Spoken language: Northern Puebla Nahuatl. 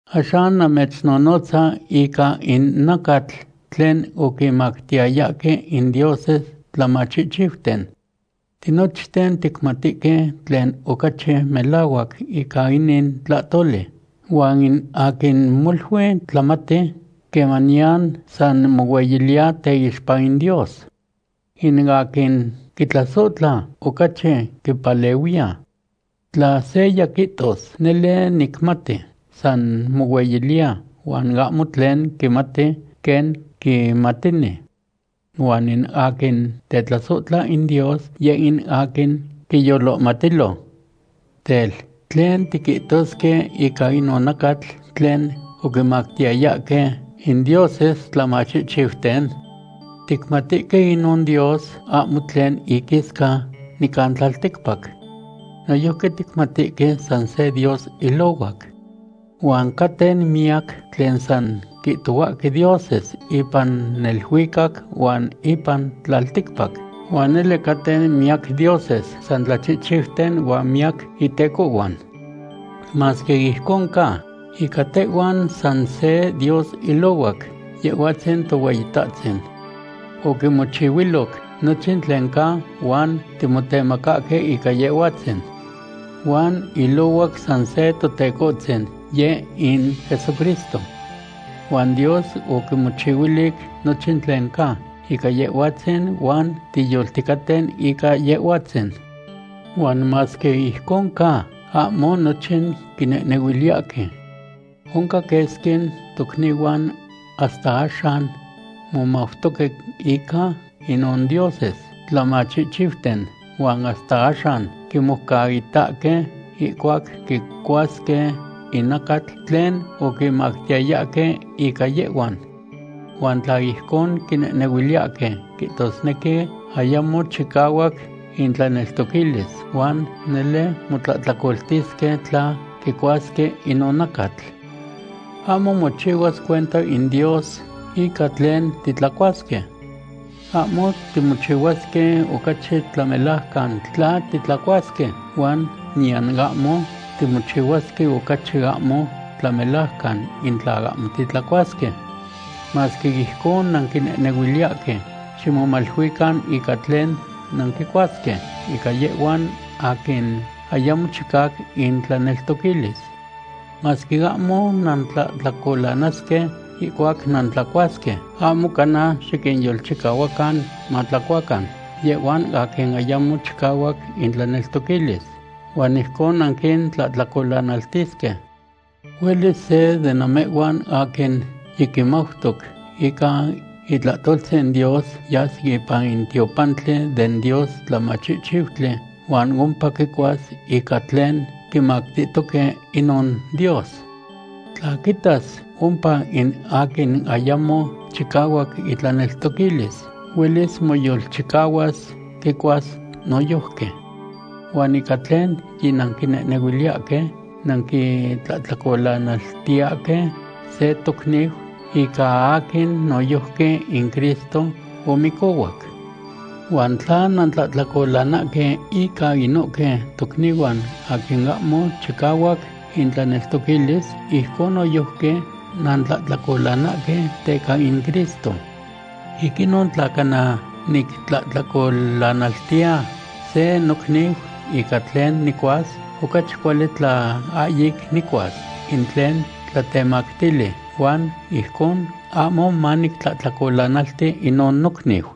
Axan namechnonotza ica in nacatl tlen oquimactiyayahque in dioses tlamachihchiuten. Tinochten ticmatihque tlen ocachi melahuac ica inin tlahtoli. Huan in aquin molui tlamati quemaniyan san mohueyiliya teixpa in Dios. In aquin quitlasohtla, ocachi quipalehuiya. Tla seya quihtos: “Nele nicmati”, san mohueyiliya huan ahmo tlen quimati quen quimatini. Huan in aquin tetlasohtla in Dios, yeh in aquin quiyolohmatilo. Tel, ¿tlen tiquihtosque ica inon nacatl tlen oquimactiyayahque in dioses tlamachihchiuten? Ticmatihque inon dios ahmo tlen iquisca nican tlalticpac. Noyojqui ticmatihque san se Dios ilohuac. Huan caten miyac tlen san quihtohuahque dioses ipan neluicac huan ipan tlalticpac, huan nele caten miyac dioses san tlachihchiuten huan miyac itecohhuan. Masque ijcon ca, ica tehhuan san se Dios ilohuac, Yehhuatzin Tohueyitahtzin. Oquimochihuiloc nochin tlen ca huan timotemacahque ica Yehhuatzin. Huan ilohuac san se Totecohtzin, yeh in Jesucristo. Huan Dios oquimochihuilic nochin tlen ca ica Yehhuatzin huan tiyolticaten ica Yehhuatzin. Huan masque ijcon ca, ahmo nochin quinehnehuiliyahque. Oncan quesqui tocnihuan hasta axan momautoque ica inon dioses tlamachihchiuten huan hasta axan quimoucaitahque ihcuac quicuasque in nacatl tlen oquimactiyayahque ica yehhuan. Huan tla ijcon quinehnehuiliyahque, quihtosnequi ayamo chicahuac intlaneltoquilis huan nele motlahtlacoltisque tla quicuasque inon nacatl. Ahmo mochihuas cuenta in Dios ica tlen titlacuasque. Ahmo timochihuasque ocachi tlamelajcan tla titlacuasque huan niyan ahmo timochihuasque ocachi ahmo tlamelajcan in tla ahmo titlacuasque. Masque ijcon nanquinehnehuiliyahque, ximomaluican ica tlen nanquichihuasque ica yehhuan aquin ayamo chicahuac intlaneltoquilis. Masque ahmo nantlahtlacolanasque ihcuac nantlacuasque, ahmo cana xiquinyolchicahuacan matlacuacan yehhuan aquin ayamo chicahuac intlaneltoquilis, huan ijcon nanquintlahtlacolanaltisque. Huelis se de namehhuan aquin yiquimautoc ica itlahtoltzin Dios yas ipan in tiopantli den dios tlamachihchiutli huan ompa quicuas ica tlen quimactihtoque inon dios. Tla quitas ompa in aquin ayamo chicahuac itlaneltoquilis, huelis moyolchicahuas quicuas noyojqui. Huan ica tlen yinanquinehnehuiliyahque, nanquitlahtlacolanaltiyahque se tocniu ica aquin noyojqui in Cristo omicohuac. Huan tla nantlahtlacolanahque inca inohque tocnihuan aquin ahmo chicahuac intlaneltoquilis, ijcon noyojqui nantlahtlacolanahque teca in Cristo. Ic inon, tla cana nictlahtlacolanaltiya se nocniu ica tlen nicuas, ocachi cuali tla ahyic nicuas in tlen tlatemactili, huan ijcon ahmo manictlahtlacolanalti inon nocniu.